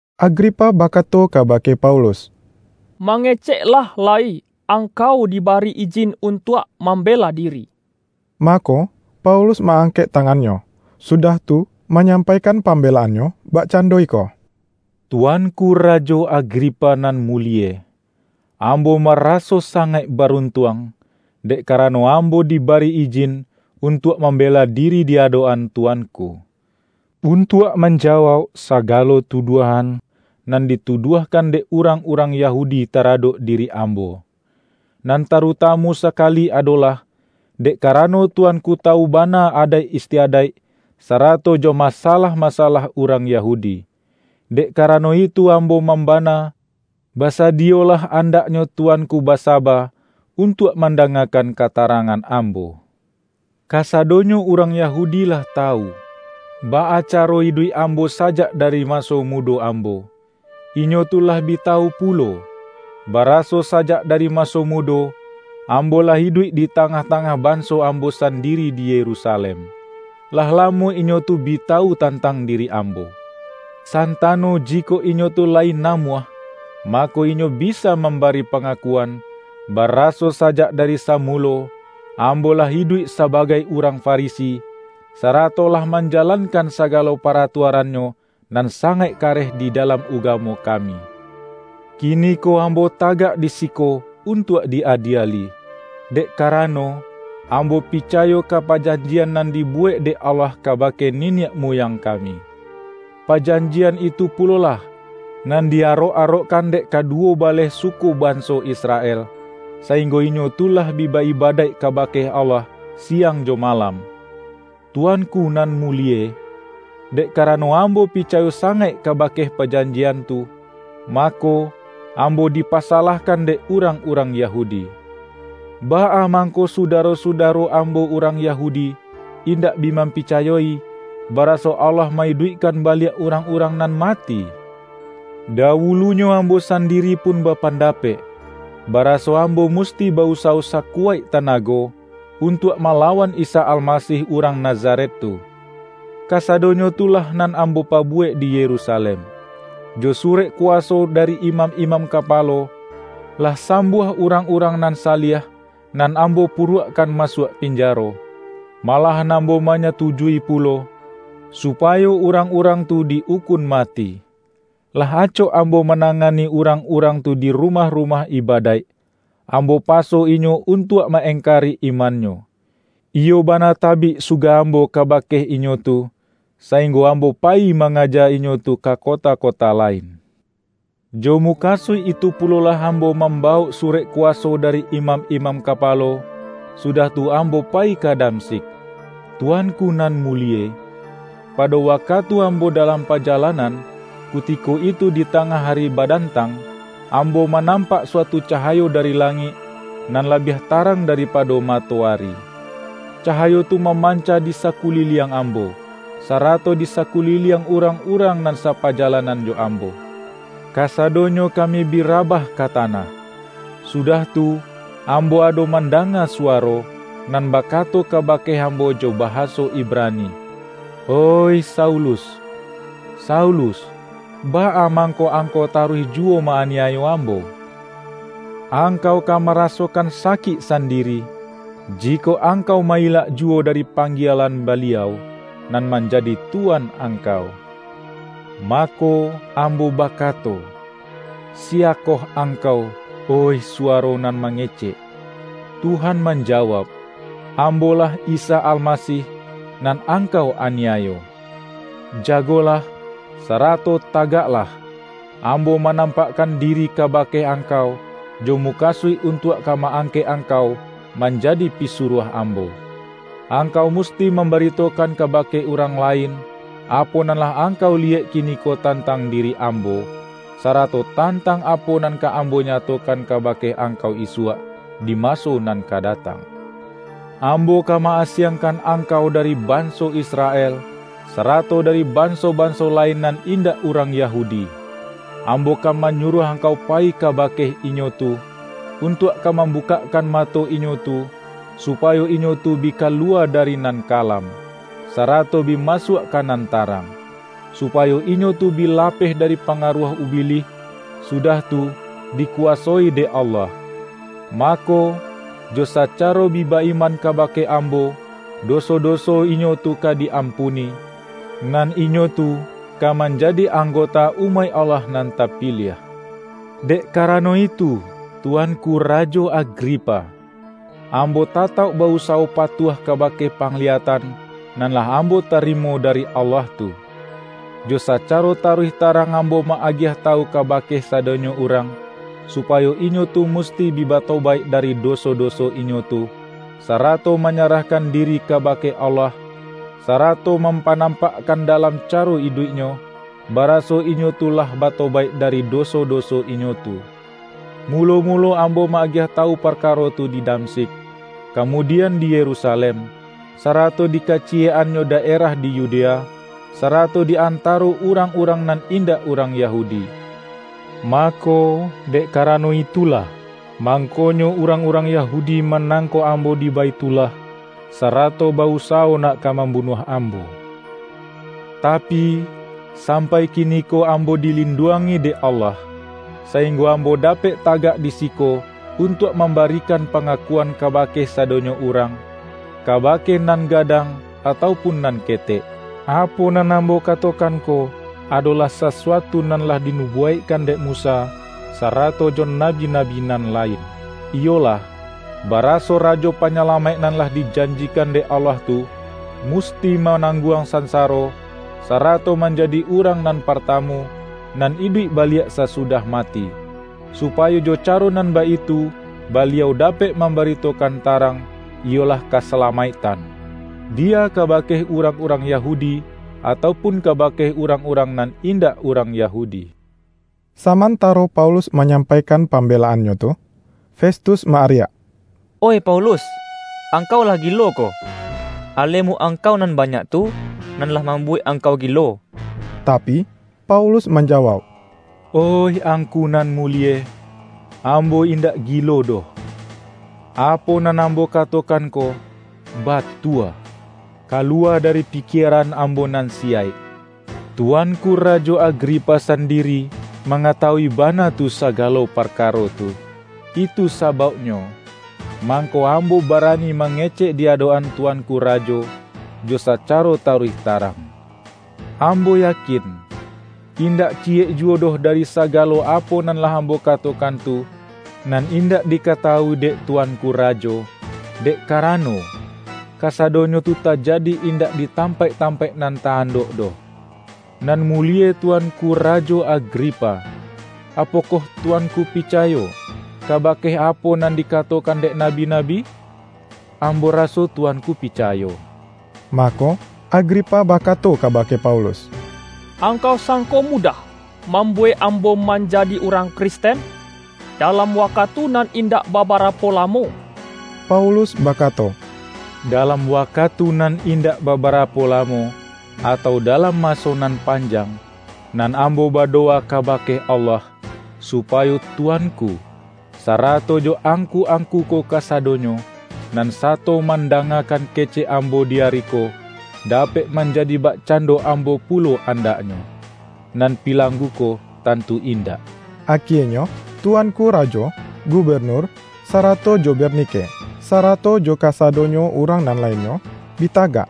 Agripa bakato kabake Paulus,”Mangeceklah lai, angkau dibari ijin untuak mambela diri.” Mako, Paulus ma-angkek tangannyo, sudah tu manyampaikan pambelaannyo, bakcando iko, ”Tuanku Rajo Agripa nan mulie! Ambo maraso sangaik baruntuang, dek karano ambo dibari ijin untuak mambela diri di adok-an Tuanku, untuak manjawauk sagalo tuduahan, nan dituduahkan dek urang-urang Yahudi taradok diri ambo; nan tarutamu sakali adolah, dek karano Tuanku tawu bana adaik istiadaik, sarato jo masalah-masalah urang Yahudi. Dek karano itu ambo mambana, basadiyolah andaknyo Tuanku basaba untuak mandangakan katarangan ambo. Kasadonyo urang Yahudi lah tawu, baa caro iduik ambo sajak dari maso mudo ambo. Inyo tu lah bi tawu pulo, baraso sajak dari maso mudo, ambo lah iduik di tangah-tangah banso ambo sandiri di Yerusalem. Lah lamo inyo tu bi tawu tantang diri ambo. Santano jikok inyo tu layi namuah, mako inyo bisa mambari pangakuan, baraso sajak dari samulo, ambo lah iduik sabagai urang Farisi, sarato lah manjalankan sagalo paratuarannyo nan sangaik kareh di dalam ugamo kami. Kiniko ambo tagak di siko untuak di-adieli, dek karano, ambo picayo ka pajanjian nan dibuwek dek Allah kabake niniak muyang kami. Pajanjian itu pulolah, nan di arok-arokkan dek kaduwo baleh suku banso Israel, sainggo inyo tu lah bi ba-ibadaik kabake Allah siang jo malam. Tuanku nan mulie, dek karano ambo picayo sangaik kabake pajanjian tu, mako, ambo dipasalahkan dek urang-urang Yahudi. Baa mangko sudaro-sudaro ambo urang Yahudi, indak bi mampicayoi, baraso Allah ma-iduikkan baliak urang-urang nan mati? Dawulunyo ambo sandiri pun bapandapek, baraso ambo musti ba-usawo sakuwaik tanago, untuak malawan Isa Almasih urang Nazaret tu. Kasadonyo tu lah nan ambo pabuwek di Yerusalem. Jo surek kuwaso dari imam-imam kapalo, lah sambuah urang-urang nan saliah, nan ambo puruakkan masuak pinjaro. Malahan ambo manyatujui pulo, supayo urang-urang tu di-ukun mati. Lah acok ambo manangani urang-urang tu di rumah-rumah ibadaik, ambo paso inyo untuak ma-engkari imannyo. Iyo bana tabik suga ambo kabake inyo tu, sainggo ambo payi mangaja inyo tu ka kota-kota lain.” ”Jo mukasuik itu pulolah ambo mambawok surek kuwaso dari imam-imam kapalo, sudah tu ambo payi ka Damsyik. Tuanku nan mulie! Pado wakatu ambo dalam pajalanan, kutiko itu di tangah ari badantang, ambo manampak suatu cahayo dari langik, nan labiah tarang daripado matoari. Cahayo tu mamanca di sakuliliang ambo, sarato di sakuliliang urang-urang nan sapajalanan jo ambo. Kasadonyo kami bi rabah ka tanah. Sudah tu ambo ado mandanga suwaro, nan bakato kabake ambo jo bahaso Ibrani, ’Oih Saulus, Saulus! Baa mangko angkau taruih juwo ma-aniayo Ambo? Angkau ka marasokan sakik sandiri, jikok angkau ma-ilak juwo dari panggielan Baliau, nan manjadi Tuan angkau.’ Mako, ambo bakato, ’Siya koh Angkau, oih suwaro nan mangecek?' Tuhan manjawauk, ’Ambo-lah Isa Almasih, nan angkau aniayo. Jagolah, sarato tagaklah! Ambo manampakkan diri kabake angkau, jo mukasuik untuak ka ma-angkek angkau manjadi pisuruah Ambo. Angkau musti mambaritokan kabake urang lain, apo nan lah angkau liyek kiniko tantang diri Ambo, sarato tantang apo nan ka Ambo nyatokan kabake angkau isuak, di maso nan ka datang. Ambo ka ma-asiangkan angkau dari banso Israel, sarato dari banso-banso lain nan indak urang Yahudi. Ambo ka manyuruah angkau payi kabake inyo tu, untuak ka mambukakkan mato inyo tu, supayo inyo tu bi kaluwa dari nan kalam, sarato bi masuak ka nan tarang; supayo inyo tu bi lapeh dari pangaruah Ubilih, sudah tu, dikuwasoi dek Allah. Mako, jo sacaro bi ba-iman kabake Ambo, doso-doso inyo tu ka di-ampuni, nan inyo tu ka manjadi anggota umaik Allah nan tapiliah.’” ”Dek karano itu Tuanku Rajo Agripa, ambo tatauk ba-usawo patuah kabake pangliyatan, nan lah ambo tarimo dari Allah tu. Jo sacaro taruih tarang ambo ma-agiah tawu kabake sadonyo urang, supayo inyo tu musti bi batobaik dari doso-doso inyo tu, sarato manyarahkan diri kabake Allah, sarato mampanampakkan dalam caro iduiknyo, baraso inyo tu lah batobaik dari doso-doso inyo tu. Mulo-mulo ambo ma-agiah tawu parkaro tu di Damsyik, kamudian di Yerusalem, sarato di kaciyek-annyo daerah di Yudea, sarato di antaro urang-urang nan indak urang Yahudi. Mako, dek karano itulah, mangkonyo urang-urang Yahudi manangkok ambo di Baithullah, sarato ba-usawo nak ka mambunuah ambo. Tapi, sampai kiniko ambo dilinduangi dek Allah, sainggo ambo dapek tagak di siko untuak mambarikan pangakuan kabake sadonyo urang — kabake nan gadang atau pun nan ketek. Apo nan ambo katokan ko, adolah sasuatu nan lah dinubuwaikkan dek Musa, sarato jo nabi-nabi nan lain; iyolah, baraso Rajo Panyalamaik nan lah dijanjikan dek Allah tu, musti manangguang sansaro, sarato manjadi urang nan partamu, nan iduik baliak sasudah mati; supayo jo caro nan baitu Baliau dapek mambaritokan tarang — iyolah kasalamaiktan — biya kabake urang-urang Yahudi atau pun kabake urang-urang nan indak urang Yahudi.” Samantaro Paulus manyampaikan pambelaannyo tu, Festus ma-ariak,”Oih Paulus, angkau lah gilo ko! Alemu angkau nan banyak tu, nan lah mambuwek angkau gilo!” Tapi, Paulus manjawauk,”Oih angku nan mulie, ambo indak gilo doh. Apo nan ambo katokan ko, batua, kaluwa dari pikieran ambo nan siyaik. Tuanku Rajo Agripa sandiri, mangatawui bana tu sagalo parkaro tu. Itu sabauknyo, mangko ambo barani mangecek di adok-an tuanku rajo, jo sacaro taruih tarang. Ambo yakin, indak ciyek juwo doh dari sagalo apo nan lah ambo katokan tu, nan indak dikatawui dek tuanku rajo, dek karano, kasadonyo tu tajadi indak di tampaik-tampaik nan ta-andok doh. Nan mulie Tuanku Rajo Agripa! Apokoh tuanku picayo, kabake apo nan dikatokan dek nabi-nabi? Ambo raso tuanku picayo!” Mako, Agripa bakato kabake Paulus,”Angkau sangko mudah, mambuwek ambo manjadi urang Kristen, dalam wakatu nan indak babarapo lamo?” Paulus bakato,”Dalam wakatu nan indak babarapo lamo, atau dalam maso nan panjang, nan ambo badowa kabake Allah, supayo Tuanku, sarato jo angku-angku ko kasadonyo, nan sato mandangakan kecek ambo di ari ko, dapek manjadi bakcando ambo pulo andaknyo — nan pilanggu ko, tantu indak!” Akienyo tuanku rajo, gubenur, sarato jo Bernike, sarato jo kasadonyo urang nan lainnyo, bi tagak.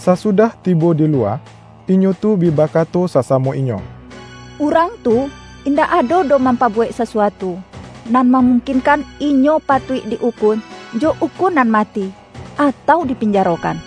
Sasudah tibo di luwa, inyo tu bi bakato sasamo inyo,”Urang tu indak ado doh mampabuwek sasuatu, nan mamungkinkan inyo patuik di-ukun jo ukunan mati, atau dipinjarokan.”